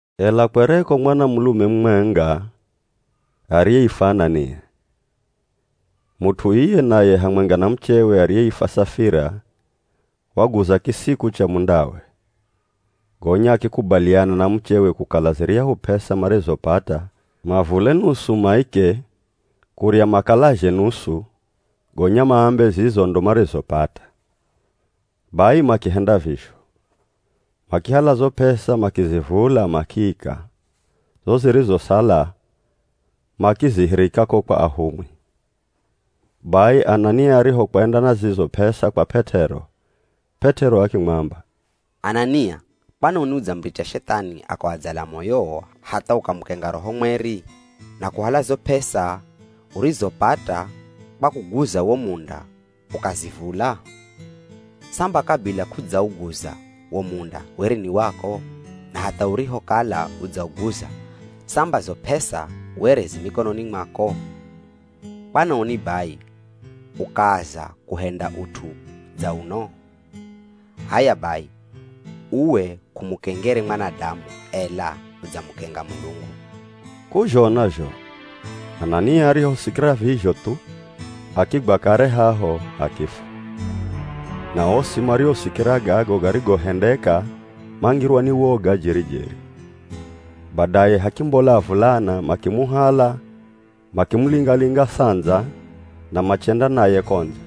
Ela kwereko mwanamulume mumwenga ariyeifwa Anania. Mut'u iye naye hamwenga na muchewe ariyeifwa Safira waguza kisiku cha mundawe. Gonya akikubaliana na muchewe kukala ziryahu p'esa marizopata mavule nusu maike, kurya makalazhe nusu, gonya maambe zizo ndo marizopata. Bai makihenda vizho. Makihala zo p'esa makizivula makiika, zo zirizosala, makizihirika ko kwa ahumwi. Bai Anania arihokwenda na zizo p'esa kwa P'et'ero, P'et'ero akimwamba, “Anania, kwanoni udzamuricha Shethani akawadzala moyowo hatha ukamukenga Roho Mweri na kuhala zo p'esa urizopata kwa kuguza wo munda ukazivula? Samba kabila k'udzauguza, wo munda were ni wako? Na hatha urihokala udzauguza, samba zo p'esa were zi mikononi mwako? Kwanoni bai ukaaza kuhenda ut'u dza uno? H'aya bai, uwe k'umukengere mwanadamu, ela udzamukenga Mulungu.” K'uzhona zho, Anania arihosikira vizho thu, akigwa kare haho akifwa. Na osi mariosikira gago garigohendeka mangirwa ni woga jeri-jeri. Badaye hakimbola avulana, makimuhala, makimulinga-linga sandza na machenda naye ko ndze,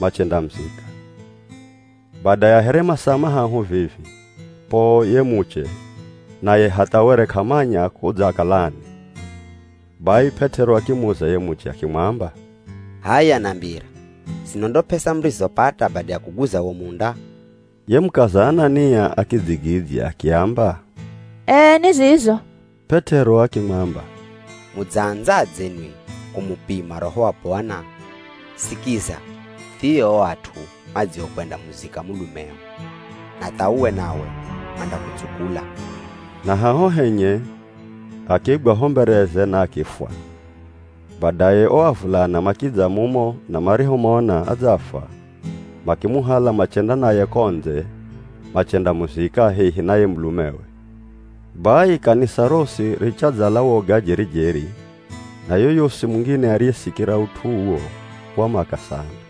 machendamuzika. Bada ya here masaa mahahu vivi, poo ye muche, naye hatha were k'amanya kudzakalani. Bai P'et'ero akimuza ye muche akimwamba, “H'aya, nambira, zino ndo p'esa murizopata bada ya kuguza wo munda?” Ye mukaza Anania akidzigidzya akiamba, “Ee, ni zizo.” P'et'ero akimwamba, “Mudzaandzadze nwi kumupima Roho wa Bwana? Sikiza, thio o at'u madziokwendamuzika mulumeo na tha uwe nawe mandakutsukula.” Na haho henye, akigwa ho mbereze na akifwa. Badaye o avulana makidza mumo na marihomona adzafwa, makimuhala machenda naye ko ndze machendamuzika hehi na ye mulumewe. Bai kanisa rosi richadzala woga jeri-jeri, na yoyosi mungine ariyesikira ut'u uwo, wamaka sana.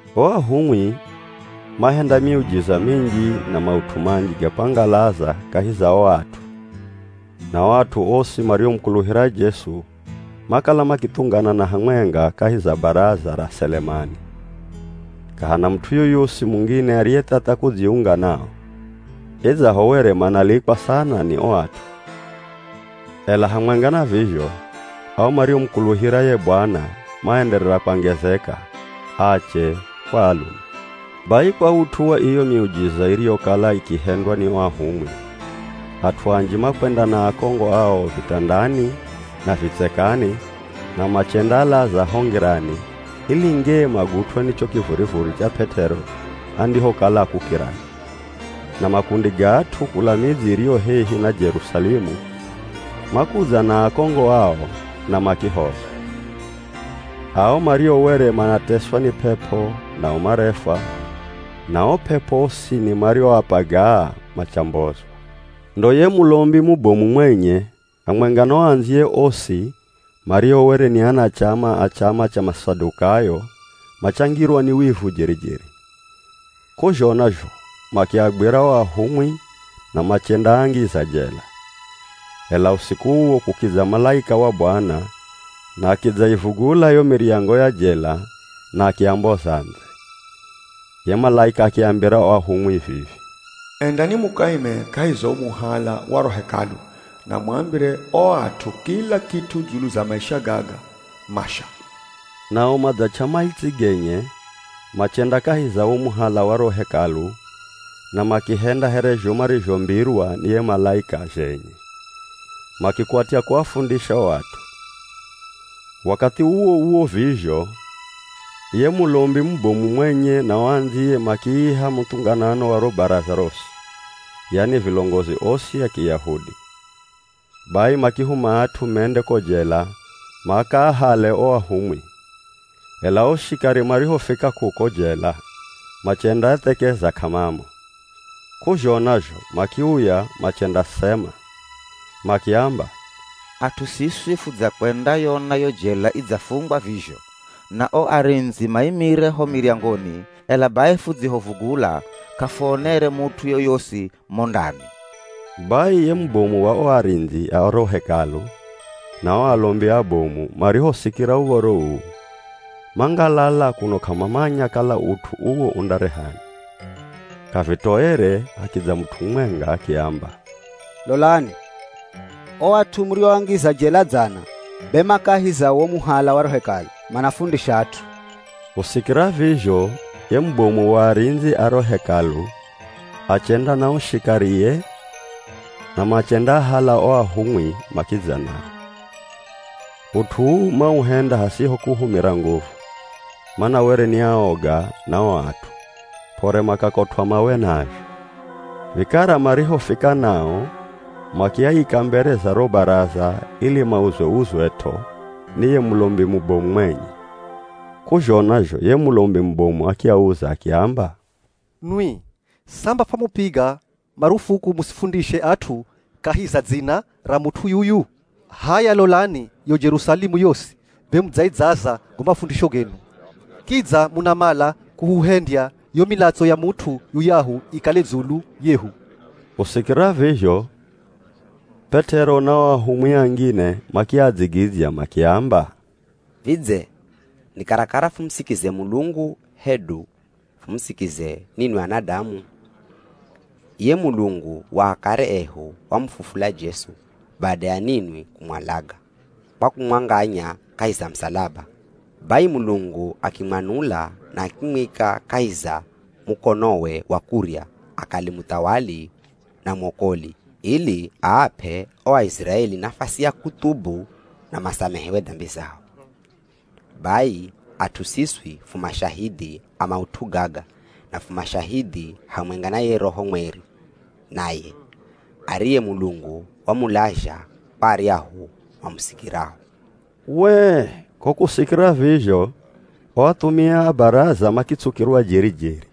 O ahumwi mahenda miujiza minji na maut'u manji ga kwangalaza kahi za o at'u. Na o at'u osi mariomukuluhira Jesu makala makithunganana hamwenga kahi za Baraza ra Selemani. K'ahana mut'u yoyosi mungine ariyethatha kudziunga nao, idzaho were manalikwa sana ni o at'u. Ela hamwenga na vizho ao mariomukuluhira ye Bwana maenderera kwangezeka, ache kwa alume. Bai kwa ut'u wa iyo miujiza iriyokala ikihendwa ni o ahumwi, at'u anji makwenda na akongo ao vitandani na vitsekani na machendaalaza ho ngirani, ili ngee magutw'e ni cho kivurivuri cha P'et'ero andihokala akukirani. Na makundi ga at'u kula midzi iriyo hehi na Jerusalemu makudza na akongo ao na makihozwa. Ao mario were manateswa ni p'ep'o nao marefwa, na o p'ep'o osini marioapagaa machambozwa. Ndo ye Mulombi mubomu mwenye hamwenga na o andziye osi mario were ni anachama a chama cha Masadukayo machangirwa ni wivu jeri-jeri. K'uzhona zho makiagwira o ahumwi na machendaangiza jela. Ela usiku uwo kukidza malaika wa Bwana na akidzaivugula yo miryango ya jela na akiamboza ndze. Ye malaika akiambira o ahumwi vivi, “Endani mukaime kahi za wo muhala wa ro Hekalu na muambire o at'u kila kit'u dzulu za maisha gaga masha!” Nao madzach'a maitsi genye machenda kahi za wo muhala wa ro Hekalu na makihenda here zho marizhombirwa ni ye malaika zhenye, makikwatya kuafundisha o at'u. Wakathi uwo-uwo vizho ye Mulombi mubomu mwenye na o andziye makiiha muthunganano wa ro Baraza rosi, yani vilongozi osi a Kiyahudi. Bai makihuma at'u mende ko jela makaahale o ahumwi. Ela o shikari marihofika kuko jela, machendaathekeza k'amamo. K'uzhona zho makiuya machendasema. Makiamba, “At'u siswi fudzakwendayona yo jela idzafungwa vizho, na o arindzi maimire ho miryangoni, ela bai fudzihovugula k'afuonere mut'u yoyosi mo ndani.” Bai ye mubomu wa o arindzi a ro Hekalu na o alombi abomu marihosikira uv̱oro uu, mangalala kuno k'amamanya kala ut'u uwo undarehani. K'avitoere hakidza mut'u mumwenga akiamba, “Lolani! O at'u murioangiza jela dzana, be ma kahi za wo muhala wa ro Hekalu, manafundisha at'u.” Kusikira vizho ye mubomu wa arindzi a ro Hekalu achenda na o shikarie na machendaahala o ahumwi makidza nao. Ut'u uu mauhenda hasiho kuhumira nguvu, mana were ni aoga na o at'u, p'ore makakotw'a mawe nazho. Vikara marihofika nao, makiaika mbere za ro Baraza ili mauzwe-uzwet'o ni ye Mulombi mubomu mwenye. K'uzhona zho ye Mulombi mubomu akiauza akiamba, “Nwi, samba fwamupiga marufuku musifundishe at'u kahi za dzina ra mut'u yuyu? H'aya lolani yo Jerusalemu yosi be mudzaidzaza go mafundisho genu. Kidza munamala kuhuhendya yo milatso ya mut'u yuyahu ikale dzulu yehu!” Kusikira vizho P'et'ero na o ahumwi angine makiadzigidzya makiamba, “Vidze ni karakara fumusikize Mulungu, hedu fumusikize ninwi anadamu? Iye Mulungu wa akare ehu wamufufula Jesu bada ya ninwi kumwalaga kwa kumwanganya kahi za musalaba. Bai Mulungu akimwanula na akimwika kahi za mukonowe wa kurya akale muthawali na mwokoli, ili aap'e o Aiziraeli nafasi ya kuthubu na masamehewe dambi zao. Bai at'u siswi fu mashahidhi a maut'u gaga, na fu mashahidhi hamwenga na ye Roho Mweri naye, ariye Mulungu wamulazha kwa aryahu mamusikirao.” Wee! Ko kusikira vizho o athumia a Baraza makitsukirwa jeri-jeri,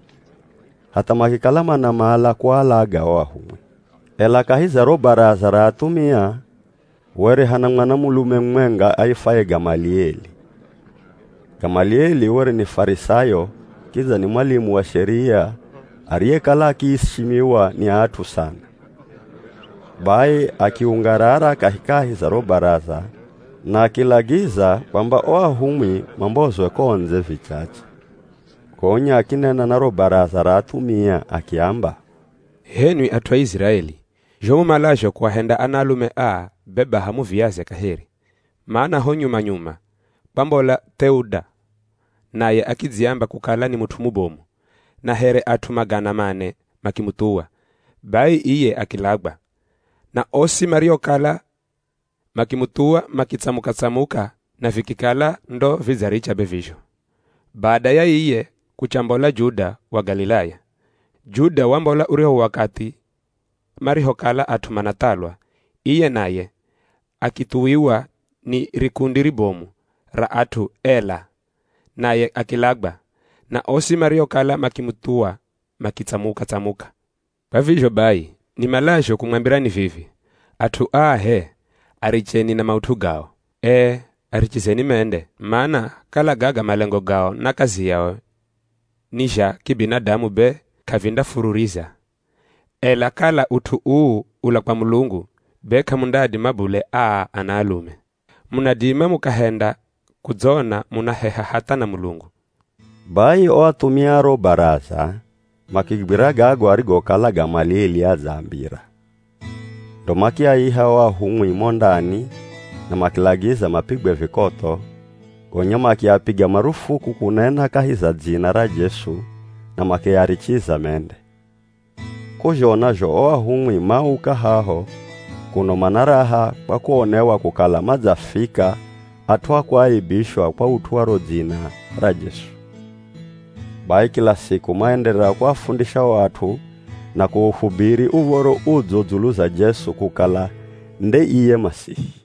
hatha makikala manamala kualaga o ahumwi. Ela kahi za ro Baraza ra athumia were hana mwanamulume mumwenga aifwaye Gamalieli. Gamalieli were ni Farisayo kidza ni mwalimu wa Sheria ariyekala akiishimiwa ni at'u sana. Bai akiungarara kahikahi za ro Baraza na akilagiza kwamba o ahumwi mambozwe ko ndze vichache. Gonya akinena na ro Baraza ra athumia akiamba, “H'enwi at'u a Iziraeli, zho mumalazho kuahenda anaalume aa, be baha muviaze kaheri. Mana ho nyuma-nyuma kwambola Th'euda naye akidziamba kukala ni mut'u mubomu, na here at'u magana mane makimuthuwa. Bai iye akilagwa, na osi mariokala makimuthuwa makitsamuka-tsamuka na vikikala ndo vidzaricha be vizho. Bada ya iye, kuchambola Juda wa Galilaya. Juda wambola uryahu wakathi marihokala at'u manathalwa, iye naye akithuwiwa ni rikundi ribomu ra at'u, ela naye akilagwa, na osi mariokala makimuthuwa makitsamuka-tsamuka. Kwa vizho bai, nimalazho kumwambira ni vivi, at'u aa h'e, aricheni na maut'u gao! Ee, arichizeni mende! Mana, kala gaga malengo gao na kazi yao ni zha kibinadamu be k'avindafururiza. Ela kala ut'u uu ula kwa Mulungu, be k'amundaadima bule aa anaalume. Munadima mukahenda kudzona munaheha hatha na Mulungu.” Bai o athumia a ro Baraza makigwira gago arigokala Gamalieli adzaambira. Ndo makiaiha o ahumwi mo ndani na makilagiza mapigwe vikotho, gonya makiapiga marufuku kunena kahi za dzina ra Jesu na makiarichiza mende. K'uzhona zho o ahumwi mauka haho kuno mana raha kwa kuonewa kukala madzafika at'u a kuaibishwa kwa ut'u wa ro Dzina ra Jesu. Bai kila siku maenderera kuafundisha o at'u na kuhubiri Uv̱oro Udzo dzulu za Jesu kukala nde iye Masihi.